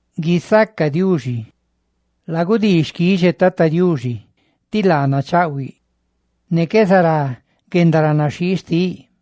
¡Guisaca Diuxi! Lagudii xquixe Tata Diuxi, ti laa nachaꞌhuiꞌ, ne qué zará guendaranaxhii xtiꞌ.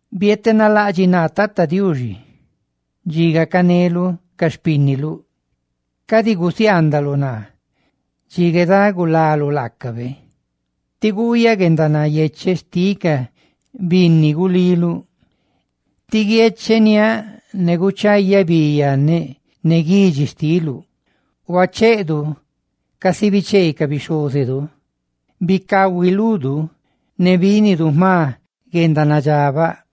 Bietenalaꞌdxiꞌ naa, Tata Diuxi, dxi gacaneluꞌ ca xpínniluꞌ; cadi gusiaandaluꞌ naa dxi guedagulaluꞌ laacabe, tí guuyaꞌ guendanayecheꞌ xtiꞌ ca binni guliluꞌ, ti guiecheniáꞌ ne guchayaꞌ bi yanneꞌ ne guidxi xtiuꞌ. Huacheedu casi bichee ca bixhózedu; bicahui ludu; ne bínidu jma guendanadxabaꞌ.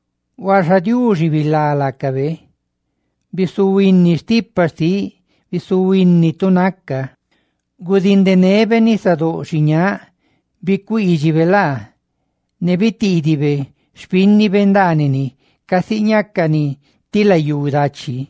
Huaxa Diuxi bilá laacabe, bisihuini guendanandxóꞌ xtiꞌ bisihuini tu naca. Gudindenebe nisadóꞌ xiñáꞌ ne bicuiidxibe laa. Ne bitiidibe xpínnibe ndaanini casi ñácani ti layú dachi.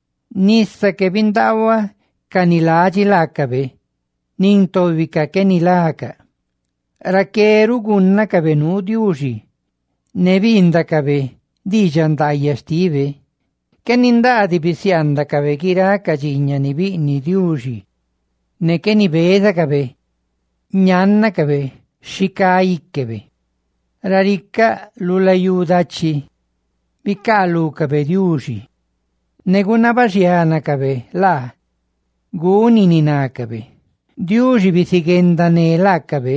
Nisa que bindaahua ca ni ladxi laacabe, nin tóbicaꞌ qué nilacaꞌ. Raqué ruꞌ gúnnacabe nuu Diuxi, ne biindacabe diidxaꞌ ndaayaꞌ xtibe. Qué nindaa diꞌ bisiaandacabe guiráꞌ ca dxiiñaꞌ ni biꞌniꞌ Diuxi, ne qué nibézacabe ñannacabe xi cá íquebe. Raricáꞌ, lu guendastubi xtiꞌ layú dachi, bicaalúcabe Diuxi, ne gunabaxiánacabe laa guni ni nácabe. Diuxi biziguendané laacabe,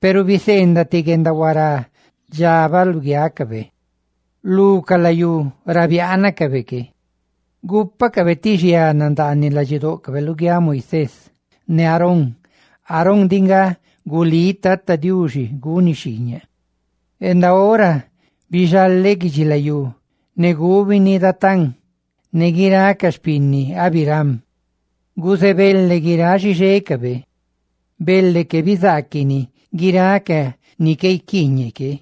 huaxa biseendaꞌ ti guendahuará nadxabaꞌ lugiácabe. Lu ca layú ra biaanacabe que, gúpacabe ti xiana ndaaniꞌ ladxidóꞌcabe luguiáꞌ Moisés, ne luguiáꞌ Aarón, Aarón diꞌ nga gulí Tata Diuxi guni xhiiñaꞌ. Raqué bixaleꞌ guidxilayú ne gubini Datán, ne guiráꞌ ca xpinni Abiram. ¡Guzebele guiráꞌ xixécabe! ¡Bele que bizaaquini guiráꞌ ca ni qué guiquiiñeꞌ que!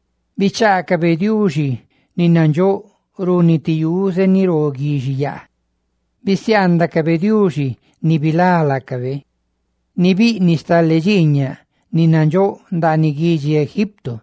¡bichaacabe Diuxi ni nandxóꞌ runi ti yuze ni ro guixiyaa! Bisiaandacabe Diuxi, ni bilá laacabe, ni biꞌniꞌ stale dxiiñaꞌ ni nandxóꞌ ndaaniꞌ guidxi Egipto,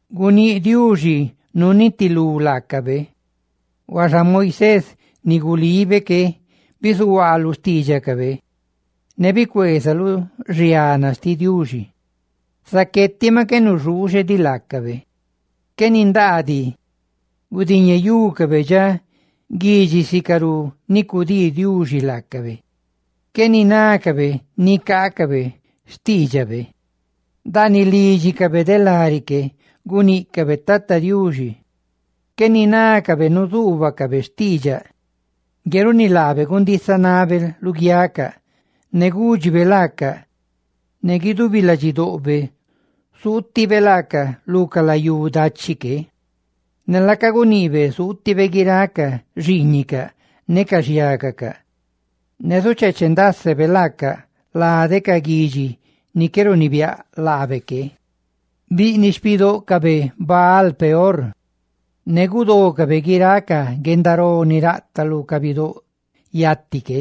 Guníꞌ Diuxi nunitilú laacabe; huaxa Moisés, ni gulibe que, bizuhuaa lu xtiidxacabe, ne bicueeza lu xiana xtiꞌ Diuxi, zaqué tiꞌ maꞌ qué nuxuuxe diꞌ laacabe. Qué nindaa diꞌ gudiñeyúcabe dxa guidxi sicarú ni cudii Diuxi laacabe, qué ninácabe nicaacabe xtiidxabe; ndaaniꞌ lídxicabe de lari que guníꞌcabe Tata Diuxi, ne qué ninácabe nuzuubacabe xtiidxaꞌ. Ngue runi laabe gundisanabe luguiacaꞌ, ne gúdxibe laacaꞌ ne guidubi ladxidoꞌbe zuutibe laaca lu ca layú dachi que, ne laaca guniꞌbe zuutibe guiráꞌ ca xiiñicaꞌ ne ca xhiágacaꞌ, ne zucheeche ndásebe laacaꞌ lade ca guidxi ni qué runibiáꞌ laabe que. Gúcacabe xpinni Baal-peor, ne gudócabe guiráꞌ ca guendaró ni raꞌtaꞌ lu ca bidóꞌ yati que.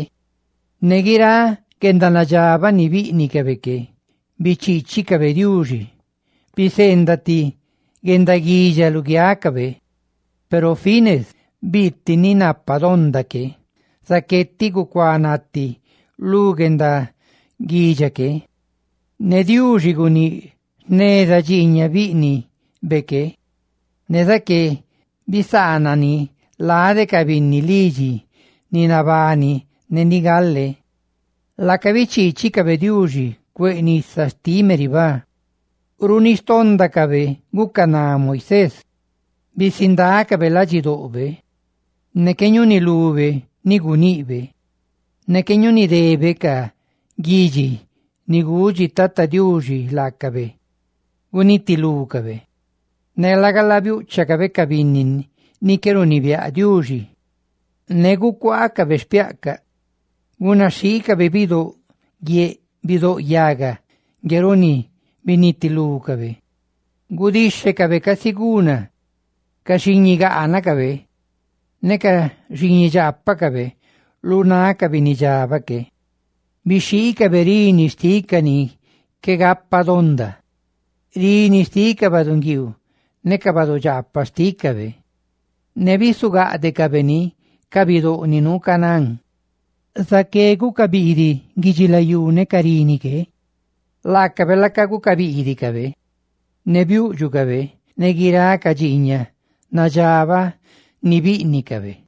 Ne guiráꞌ guendanadxabaꞌ ni bíꞌnicabe que bichiichicabe Diuxi, biseendaꞌ ti guendaguidxa luguiácabe. Peru Finees biasa ne biiti ni napa donda que, zaqué tiꞌ gucuanati lu guendaguidxa que. Ne Diuxi guníꞌ jneza nuu dxiiñaꞌ bíꞌnibe que, ne zaqué bisaanani lade ca binni lídxibe ni nabani ne ni chigale ruꞌ. Laaca bichiichicabe Diuxi cueꞌ nisa xtiꞌ Meribá, ne runi xtóndacabe gucaná Moisés; bisindácabe ladxidoꞌbe, ne qué ñúnilube ni guniꞌbe. Ne qué ñunidécabe ca guidxi ni gudxi Tata Diuxi laacabe gunitilúcabe. Laga la, biúꞌchacabe ca binni ni qué runibiáꞌ Diuxi, ne gucuaacabe xpiaꞌcaꞌ; gunaxhiicabe bidóꞌ guie, bidóꞌ yaga, ngue runi binitilúcabe, gudíxhecabe casi guna ca xiñigaanacabe ne ca xiñidxaapacabe lu náꞌ ca binnidxabaꞌ que. Bixhiicabe rini xtiꞌ ca ni qué gapa donda, rini xtiꞌ ca baꞌdunguiiu ne ca badudxaapaꞌ xtícabe, ne bizugáꞌdecabe ni ca bidóꞌ ni nuu Canaán. Zaqué guca biidiꞌ guidxilayú ne ca rini que, laacabe laaca gucabiidicabe ne biúꞌdxucabe ne guiráꞌ ca dxiiñaꞌ nadxabaꞌ ni bíꞌnicabe.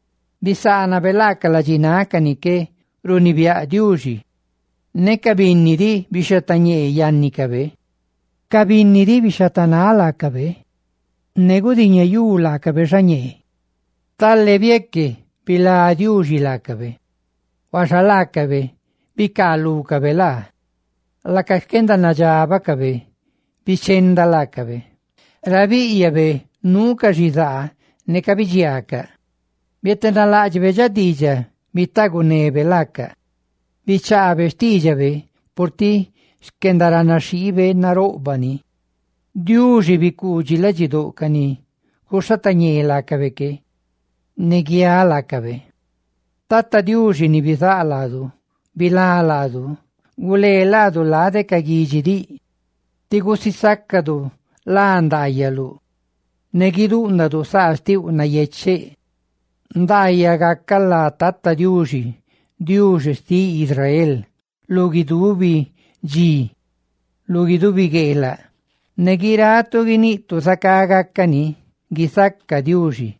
bisaanabe laacaꞌ ladxináꞌ ca ni qué runibiáꞌ Diuxi, ne ca binni diꞌ bixhatañee yannicabe; ca binni diꞌ, bixhatañee laacabe, ne gudiñeyú laacabe xañee. Stale bieque bilá Diuxi laacabe, huaxa laacabe bicaalúcabe laa, laaca xquendanadxabacabe bichenda laacabe. Ra bíꞌyabe, nuucaꞌ xizaa ne cabidxiaacaꞌ, bietenaláꞌdxibe dxa diidxaꞌ bitaagunebe laacaꞌ bichaabe xtiidxabe, purtiꞌ xquendaranaxhiibe naroꞌbaꞌ ni; ¡Diuxi bicuudxi ladxidóꞌ ca ni cuxhatañee laacabe que, ne ca ngue biaꞌ laacabe! ¡Tata Diuxi ni bizáꞌ laadu, bilá laadu! ¡Gulee laadu lade ca guidxi diꞌ ti gusisácadu lá ndaayaluꞌ, ne guiduundadu saa xtiuꞌ nayecheꞌ! ¡Nandaayaꞌ gacaꞌ lá Tata Diuxi, Diuxi xtiꞌ Israel, lu guidubi dxi, lu guidubi gueelaꞌ! ¡Ne guiratu guiniꞌtu: «Zacá gácani»! ¡Guisaca Diuxi!